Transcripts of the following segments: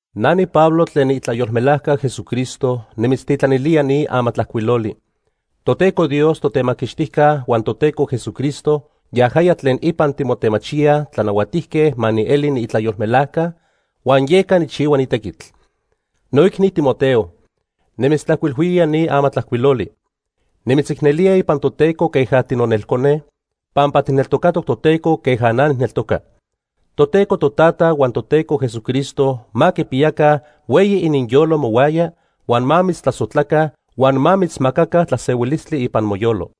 Na niPablo tlen niitlayolmelajca Jesucristo nimitztitlanilía ni amatlajcuiloli. Toteco Dios Totemaquixtijca huan Toteco Jesucristo yajaya tlen ipan timotemachiyaj tlanahuatijque ma nieli niitlayolmelajca huan yeca nijchihua ni tequitl. Noicni Timoteo, nimitztlajcuilhuía ni amatlajcuiloli. Nimitzicnelía ipan Toteco queja tinonelcone, pampa tijneltocatoc Toteco queja na nijneltoca. Toteco Totata huan Toteco Jesucristo ma quipiyaca hueyi ininyolo mohuaya huan ma mitztlasojtlaca, huan ma mitzmacaca tlasehuilistli ipan moyolo.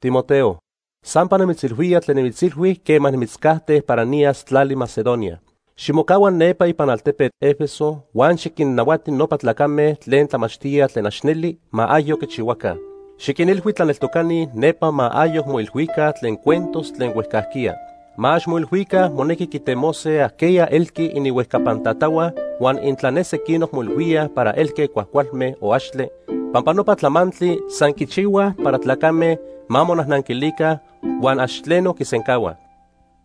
Timoteo, sampa nimitzilhuía tlen nimitzilhui quema nimitzcajte para niyas tlali Macedonia. Ximocahua nepa ipan altepetl Éfeso huan xiquinnahuati nopa tlacame tlen tlamachtíaj tlen ax neli ma ayoc quichihuaca. Xiquinilhui tlaneltocani nepa ma ayoc moilhuica tlen cuentos tlen huejcajquiya. Ma ax moilhuica monequi quitemose ajqueya elqui ininhuejcapan tatahua huan intla ne sequinoc moilhuíaj para elque cuajcualme o axtle, pampa nopa tlamantli san quichihuaj para tlacame ma monajnanquilica huan ax tleno quisencahuaj.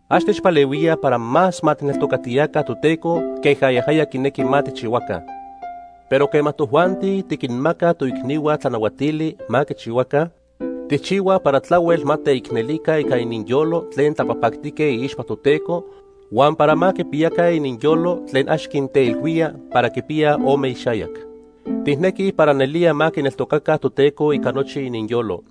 Ax techpalehuíaj para más ma tijneltocatiyaca Toteco queja yajaya quinequi ma tijchihuaca. Pero quema tojuanti tiquinmacaj toicnihua tlanahuatili ma quichihuaca, tijchihuaj para tlahuel ma teicnelica ica ininyolo tlen tlapajpactique iixpa Toteco huan para ma quipiyaca ininyolo tlen ax quinteilhuía para quipiyaj ome ixayac. Tijnequij para nelía ma quineltocaca Toteco ica nochi ininyolo.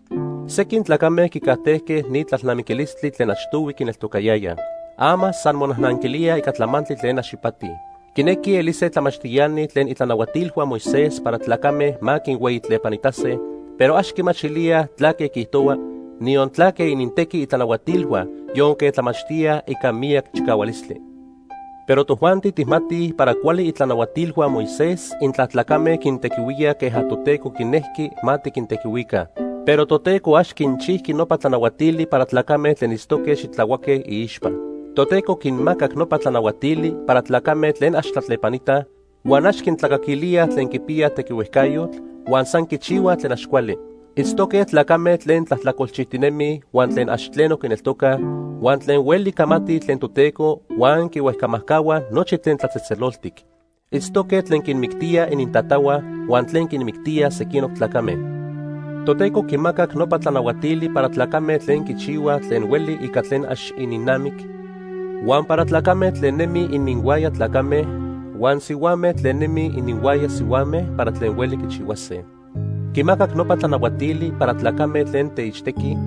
Sequin tlacame quicajtejque ni tlalnamiquilistli tlen achtohui quineltocayayaj. Ama san monajnanquilíaj ica tlamantli tlen ax ipati. Quinequij elise tlamachtiani tlen itlanahuatilhua Moisés para tlacame ma quinhueyitlepanitase, pero ax quimachilíaj tlaque quiijtohuaj, niyon tlaque inintequi itlanahuatilhua yonque tlamachtíaj ica miyac chicahualistli. Pero tojuanti tijmatij para cuali itlanahuatilhua Moisés intla tlacame quintequihuíaj queja Toteco quinejqui ma tiquintequihuica. Pero Toteco ax quinchijqui nopa tlanahuatili para tlacame tlen itztoque xitlahuaque iixpa. Toteco quinmacac nopa tlanahuatili para tlacame tlen ax tlatlepanitaj, huan ax quintlacaquilíaj tlen quipiyaj tequihuejcayotl, huan san quichihuaj tlen ax cuali. Itztoque tlacame tlen tlajtlacolchijtinemij huan tlen ax tleno quineltocaj, huan tlen hueli camatij tlen Toteco huan quihuejcamajcahua nochi tlen tlatzejtzeloltic. Itztoque tlen quinmictíaj inintatahua huan tlen quinmictíaj sequinoc tlacame. Toteco quimacac nopa tlanahuatili para tlacame tlen quichihuaj tlen hueli ica tlen ax ininnamic, huan para tlacame tlen nemij ininhuaya tlacame, huan sihuame tlen nemij ininhuaya sihuame para tlen hueli quichihuase. Quimacac nopa tlanahuatili para tlacame tlen teixtequij,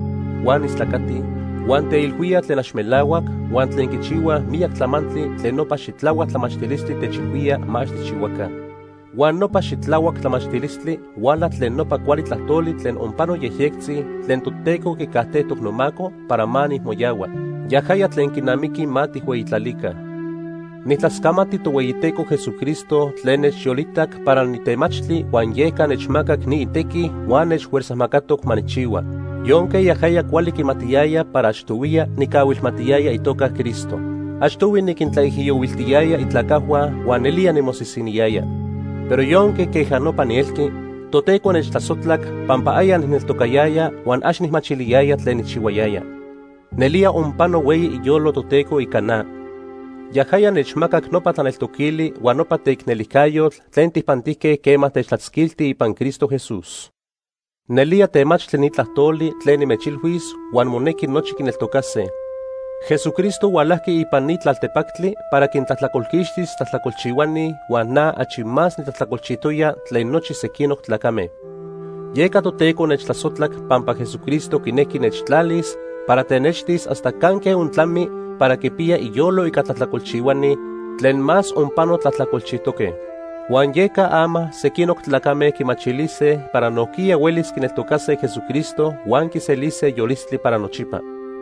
huan istlacatij, huan teilhuíaj tlen ax melahuac huan tlen quichihuaj miyac tlamantli tlen nopa xitlahuac tlamachtilistli techilhuía ma ax tijchihuaca. Huan nopa xitlahuac tlamachtilistli huala tlen nopa cuali tlajtoli tlen onpano yejyectzi tlen Toteco quicajtejtoc nomaco para ma nijmoyahua. Yajaya tlen quinamiqui ma tijhueyitlalica. Nijtlascamati Tohueyiteco Jesucristo tlen nechyolitac para nitemachtli huan yeca nechmacac ni itequi huan nechfuerzajmacatoc ma nijchihua. Yonque yajaya cuali quimatiyaya para achtohuiya nicahuilmatiyaya itoca Cristo. Achtohui niquintlaijiyohuiltiyaya itlacajhua huan nelía nimosisiniyaya. Pero yonque queja nopa nielqui, Toteco nechtlasojtlac pampa aya nijneltocayaya huan ax nijmachiliyaya tlen nijchihuayaya. Nelía onpano hueyi iyolo Toteco ica na. Yajaya nechmacac nopa tlaneltoquili huan nopa teicnelijcayotl tlen tijpantijque quema techtlatzquilti ipan Cristo Jesús. Nelía temachtli ni tlajtoli tlen nimechilhuis huan monequi nochi quineltocase: Jesucristo hualajqui ipan ni tlaltepactli para quintlajtlacolquixtis tlajtlacolchihuani huan na achi más nitlajtlacolchijtoya tlen nochi sequinoc tlacame. Yeca Toteco nechtlasojtlac pampa Jesucristo quinejqui nechtlalis para tenextis hasta canque ontlami para quipiya iyolo ica tlajtlacolchihuani tlen más onpano tlajtlacolchijtoque. Huan yeca ama sequinoc tlacame quimachilise para nojquiya huelis quineltocase Jesucristo huan quiselise yolistli para nochipa.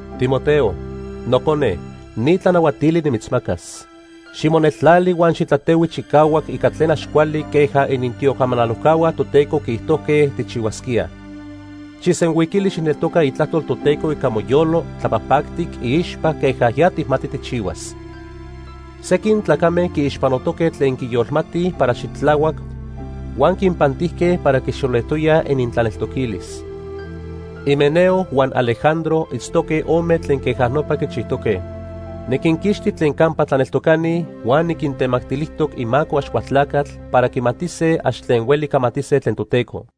Timoteo, nocone, ni tlanahuatili nimitzmacas. Ximoneltlali huan xitlatehui chicahuac ica tlen ax cuali queja inintiocamanalojcahua Toteco quiijtojque tijchihuasquía. Xijsenhuiquili xijneltoca itlajtol Toteco ica moyolo tlapajpactic iixpa queja ya tijmati tijchihuas. Sequin tlacame quiixpanotoque tlen quiyolmatij para xitlahuac huan quinpantijque para quixolejtoyaj inintlaneltoquilis. Himeneo huan Alejandro itztoque ome tlen queja nopa quichijtoque. Niquinquixti tlen campa tlaneltocani huan niquintemactilijtoc imaco Axcualtlacatl para quimatise ax tlen hueli camatise tlen Toteco.